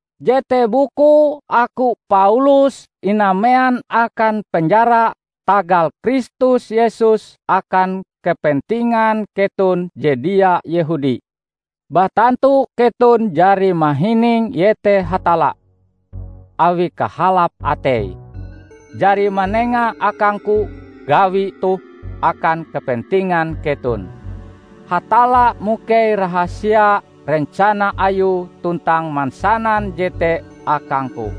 Jete bukue aku, Paulus, inamean akan penjara tagal Kristus Yesus akan kepentingan keton je dia Yehudi. Batantu keton jari mahining iete Hatalla, awi kahalap Ateie, jari manenga akangku gawi toh akan kepentingan keton. Hatalla mukei rahasia rencana Ayue tuntang mansanan jete akangku.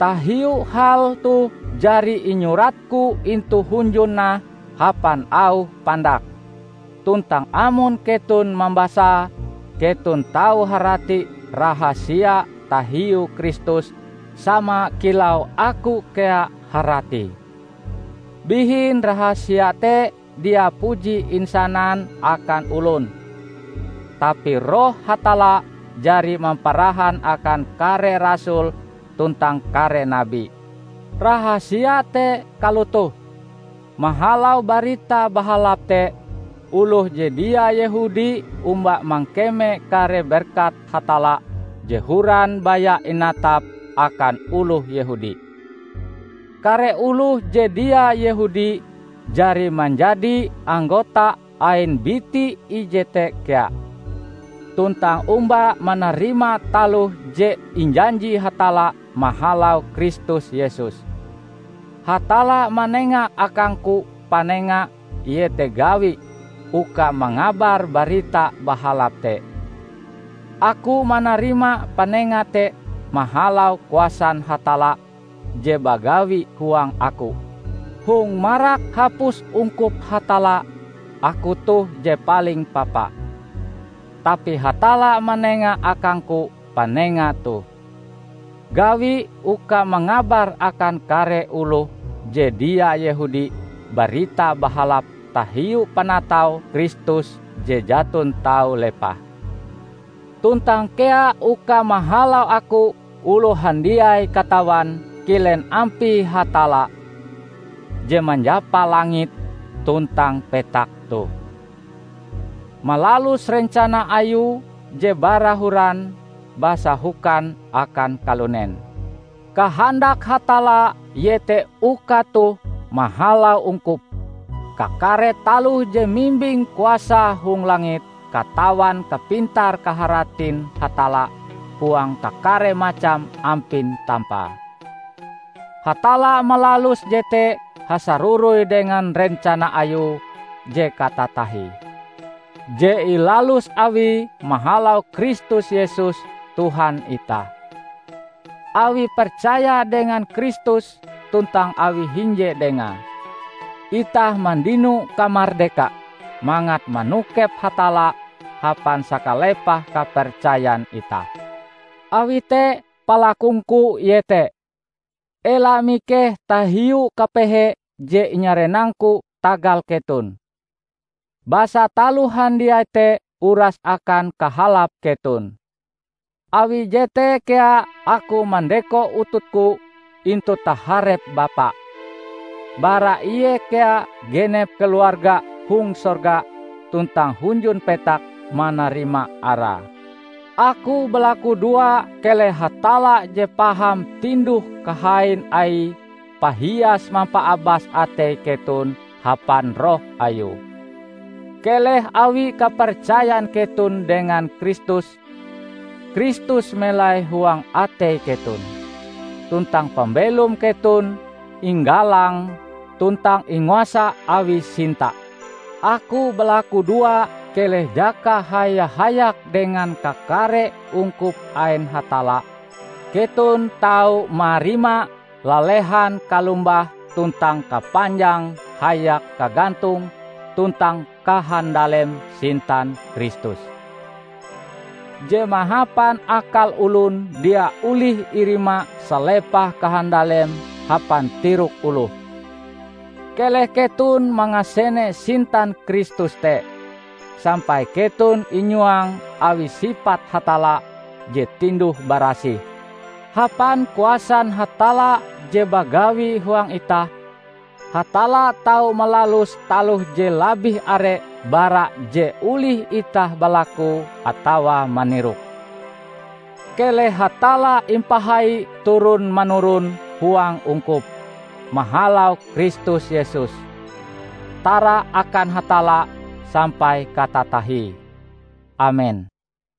(Tahiu hal toh jari inyuratku intu hunjun nah hapan auh pandak, tuntang amon keton mambasae, keton tau harati rahasia tahiu Kristus sama kilau aku kea haratie.) Bihin rahasia te dia puji insanan akan olon, tapi Roh Hatalla jari mamparahan akan kare rasul tuntang kare nabi. Rahasia te kalotoh: Mahalau Barita Bahalap te, oloh je dia Yehudi omba mangkeme kare berkat Hatalla je horan baya inatap akan oloh Yehudi. Kare oloh je dia Yehudi jari manjadi anggota ain biti ije te kea, tuntang omba manarima taloh je injanji Hatalla mahalau Kristus Yesus. Hatalla manenga akangku panenga -- iete gawi -- uka mangabar Barita Bahalap te. Aku manarima panenga te mahalau kuasan Hatalla je bagawi huang aku. Hong marak hapus ungkup Hatalla, aku toh je paling papa. Tapi Hatalla manenga akangku panenga toh: gawi uka mangabar akan kare oloh je dia Yehudi Barita Bahalap tahiu panatau Kristus je jaton tau lepah; tuntang kea uka mahalau aku oloh handiai katawan kilen ampie Hatalla, Je Manjapa langit tuntang petak toh, malalus rencana Ayue je bara horan basahokan akan kalunen. Kahandak Hatalla iete uka toh, mahalau ungkup, kakare taloh je mimbing kuasa hong langit katawan kapintar-kaharatin Hatalla huang kakare macam ampin tampae. Hatalla malalus jete hasaroroi dengan rencana Ayue je katatahie, je ilalus Awie mahalau Kristus Yesus Tuhan itah. Awi percaya dengan Kristus tuntang awi hinje Dengae, itah mandino kamardeka mangat manokep Hatalla hapan sakalepah kapercayan itah. Awi te, palakungku iete: ela mikeh tahiu kapehe je inyarenangku tagal keton, basa taloh handiai te uras akan kahalap keton. Awi jete kea aku mandeko ututku intu taharep Bapa. Bara Ie kea genep keluarga hong sorga tuntang hunjun petak manarima Arae. Aku balakudoa keleh Hatalla je paham tinduh-kahain Aie pahias mampaabas atei keton hapan Roh Ayue. Keleh awi kapercayan keton dengan Kristus, Kristus melai huang atei keton, tuntang pambelom keton inggalang tuntang inguasa awi sinta. Aku balakudoa keleh jaka haya-hayak dengan kakare ungkup ain Hatalla, keton tau marima lalehan kalombah tuntang kapanjang hayak kagantong tuntang kahandalem sintan Kristus, je mahapan akal olon dia olih irima salepah kahandalem hapan tirok oloh. Keleh keton mangasene sintan Kristus te, sampai keton inyuang awi sipat Hatalla je tinduh-barasih. Hapan kuasan Hatalla je bagawi huang itah, Hatalla tau malalus taloh je labih are bara je olih itah balakue atawa maniroke. Keleh Hatalla impahai turon-manuron huang ungkup, mahalau Kristus Yesus. Tara akan Hatalla sampai katatahie! Amen.